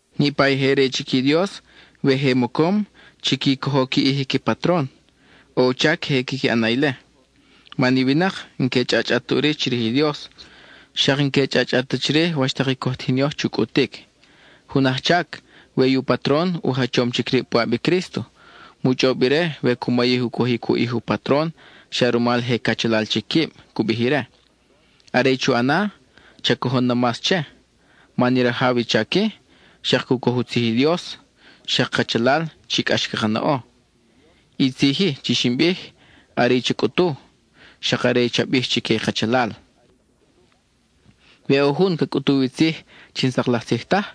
Niʼpa i je re chic i Dios, we je mocom, chiqui cojo qui ʼij i qui patron. ʼO u chac queje quiqui ʼan na ile, man i winak n-que chʼachʼat ta ʼuri chirij i Dios, xak n-que chʼachʼat ta chirij wach tak i coj tijin yoj chu cʼutic. Jun ajchac, we i u patron u jachom chic rib puʼab i Crísto, mu chʼob ire we cu mayij u cojic u ʼij u patron xa rumal je cachalal chic quib, cu bij ire. Are i chu ʼana, cha cojon na mas che, man i rajaw i chac-i, xak cu coj u tzij i Dios, xak kachalal chi cʼax caka na ʼo. I tzij-i chi xin bij, are i cha cʼutu, xak are i cha bij chique i kachalal. We ʼo jun ca cʼutuw i tzij chi n-sak laj tzij taj,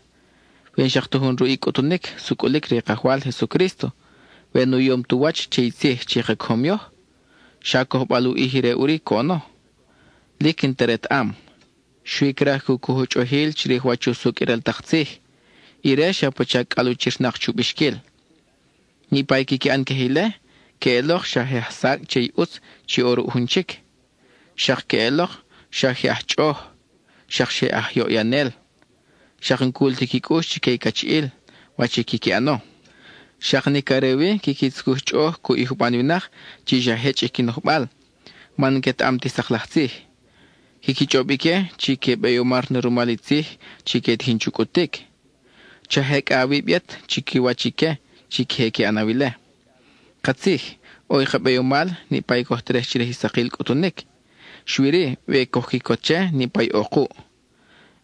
we n-xak ta jun ruʼ i cʼutunic sucʼulic re i Kajwal Jesucrísto, we nu yom tu wach che i tzij chi ka cojom yoj, xa cojbal u ʼij ire ʼuri coʼono; lic n-ta retaʼam. Xui craj cu coj u chʼojil chirij wach usucʼ i ral tak tzij; ire xa pacha cʼalwachirnak chu bixquil. Niʼpa i quiqui ʼan queje ile queʼelok xa je ajsacʼ che i ʼutz chi ʼo ruʼ jun chic; xak queʼelok xa je aj chʼoʼoj; xak xa je aj yoʼyanel; xak n-cul ti qui cʼux chique i cachiʼil, wach i quiqui ʼano; xak nic are wi quiqui tzucuj chʼoʼoj cuʼ i juban winak chi xa jechʼ i qui nojbal, man n-quetaʼam ti sak laj tzij. Quiqui chʼob ique chi que beyomar na rumal i tzij chi que tijin chu cʼutic. Cha jecʼa awib yet chiquiwach ique chi queje que ʼanaw ile. Katzij, ʼo i ka beyomal niʼpa i coj terej chirij i sakil cʼutunic, xui-ri, we coj quicot che niʼpa i ʼo kuʼ.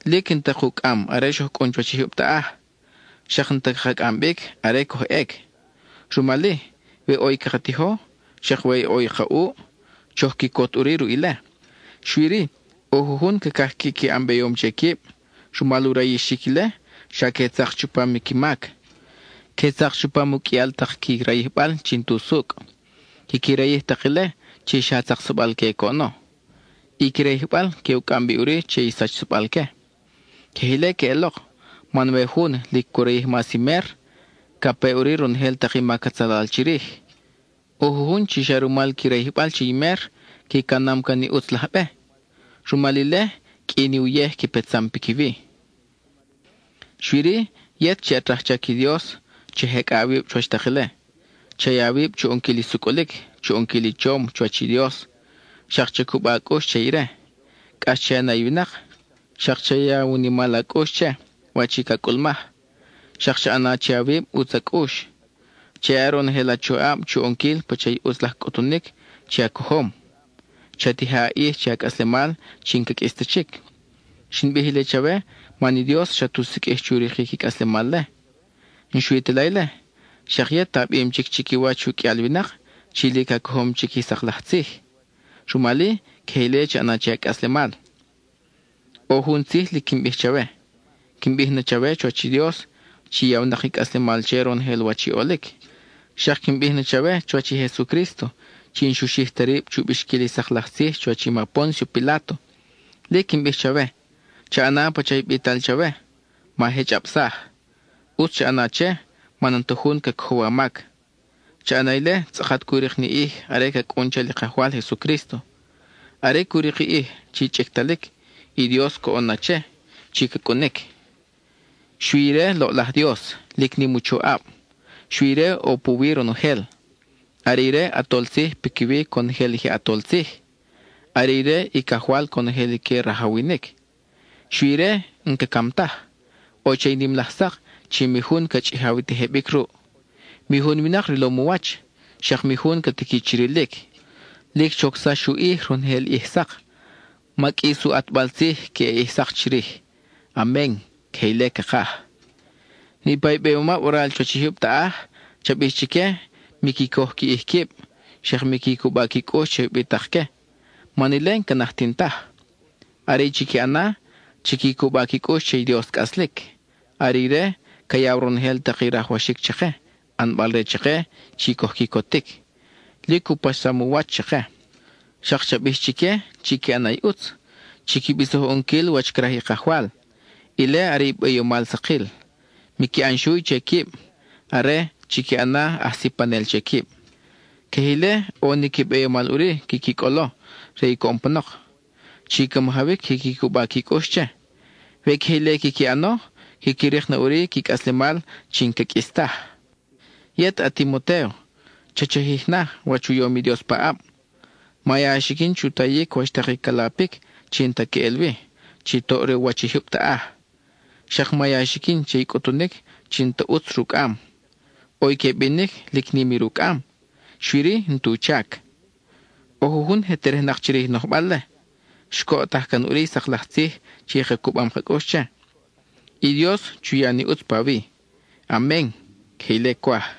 Lic n-ta kucʼam are xoj cʼun chuwach i jyub taʼaj; xak n-ta caka cʼam bic are coj ʼec. Rumal-i, we ʼo i caka tijo, xak we ʼo i ka ʼuʼ, choj quicot ʼuri ruʼ ile. Xui-ri, ʼo jujun cacaj quiqui ʼan beyom che quib; rumal u rayixic ile, xa que tzak chupam qui mac, que tzak chupam i u qʼuial tak qui rayijbal chi n-tusucʼ. Quiqui rayij tak ile chi xa tzaksabal-que coʼono. I qui rayijbal que u cʼam bi ʼuri che i sachsabal-que. Queje ile queʼelok, man we jun lic cu rayij mas i mer, ca pe ʼuri ronojel tak i mac atzalal chirij. ʼO jujun chi xa rumal qui rayijbal che i mer, qui canam can i ʼutz laj be; rumal ile qʼui ni uyej qui petsam piquiwi. Xui-ri, yet chi at rajchac i Dios cha jecʼa awib chuwach tak ile. Cha ya awib chu ʼonquil i sucʼulic, chu ʼonquil i chom chuwach i Dios; xak cha cuba a cʼux che ire; cʼax che a na i winak; xak cha ya u nimal a cʼux che, wach i ca cʼulmaj; xak cha ʼana che awib ʼutz a cʼux. Cha ya ronojel a choʼab chu ʼonquil pacha i ʼutz laj cʼutunic chi a cojom. Cha tija a ʼij che a cʼaslemal chi n-ca qʼuis ta chic. Xin bij ile chawe man i Dios xat u siqʼuij chu rikic i cʼaslemal-le. N-xui ta la ile, xak yet a bim chic chiquiwach u qʼuial winak chi lic a cojom chic i sak laj tzij; rumal-i, queje ile cha ʼana che a cʼaslemal. ʼO jun tzij lic quin bij chawe; quin bij na chawe chuwach i Dios chi yawnak i cʼaslemal che ronojel wach i ʼolic; xak quin bij na chawe chuwach i Jesucrísto chi n-xu xij ta rib chu bixquil i sak laj tzij chuwach i ma Póncio Piláto. Lic quin bij chawe: cha ʼana pacha i bital chawe; ma jechʼabsaj. ʼUtz cha ʼana che, man n-ta jun ca cojow a mac. Cha ʼana ile tzʼakat cu rik ni ʼij are ca cʼun chal i Kajwal Jesucrísto. Are cu rik i ʼij chi chʼictalic, i Dios coʼon na che chi ca cʼunic. Xui ire loʼlaj Dios, lic nim u choʼab; xui ire ʼo puwi ronojel. Are ire ʼAtol Tzij piquiwi conojel i je ʼatol tzij; are ire i Cajwal conojel i que rajawinic. Xui ire n-ca cam taj; ʼo che i nim laj sak chi mi jun ca chʼijaw i tejebic ruʼ. Mi jun winak rilom u wach, xak mi jun ca tiqui chi rilic. Lic chocsax u ʼij ronojel ʼij sak; ma qʼuis i u ʼatbal tzij queʼe ʼij sak chirij. Amen (queje ile cakaj). Niʼpa i beyomab waral chuwach i jyub taʼaj, cha bij chique miqui coj qui ʼij quib, xak miqui cuba qui cʼux che ubitakque, man ile n-ca najtin taj. Are i chiqui ʼana, chiqui cuba qui cʼux che i Dios cʼaslic. Are ire ca yaw ronojel tak i rajwaxic chake, ʼanbal re chake chi coj quicotic; lic u paxsam u wach chake. Xak cha bij chique chiqui ʼana i ʼutz; chiqui bisoj u ʼonquil wach craj i Kajwal, ile are i beyomal sakil. Miqui ʼan xuy che quib, are, chiqui ʼana aj sipanel che quib. Queje ile ʼo ni qui beyomal ʼuri quiqui cʼolo re i coʼon panok, chi ca majawic quiqui cuba qui cʼux che. We queje ile quiqui ʼano, quiqui rik na ʼuri qui cʼaslemal chi n-ca qʼuis taj. Yet, a-Timotéo, cha chajij na wach u yom i Dios paʼab. Ma ya a xiquin chu tayic wach tak i ca lapic chi n-ta queʼel wi, chi toʼ re u wach i jyub taʼaj; xak ma ya a xiquin che i cʼutunic chi n-ta ʼutz rucʼam. ʼO i que binic chi lic nim i rucʼam, xui-ri, n-tu chac. ʼO jujun je terejnak chirij i nojbal-le; xcoʼtaj can ʼuri i sak laj tzij chi ka cubam ka cʼux che. I Dios chu ya ni ʼutz pawi. Amen (queje ile cwaj).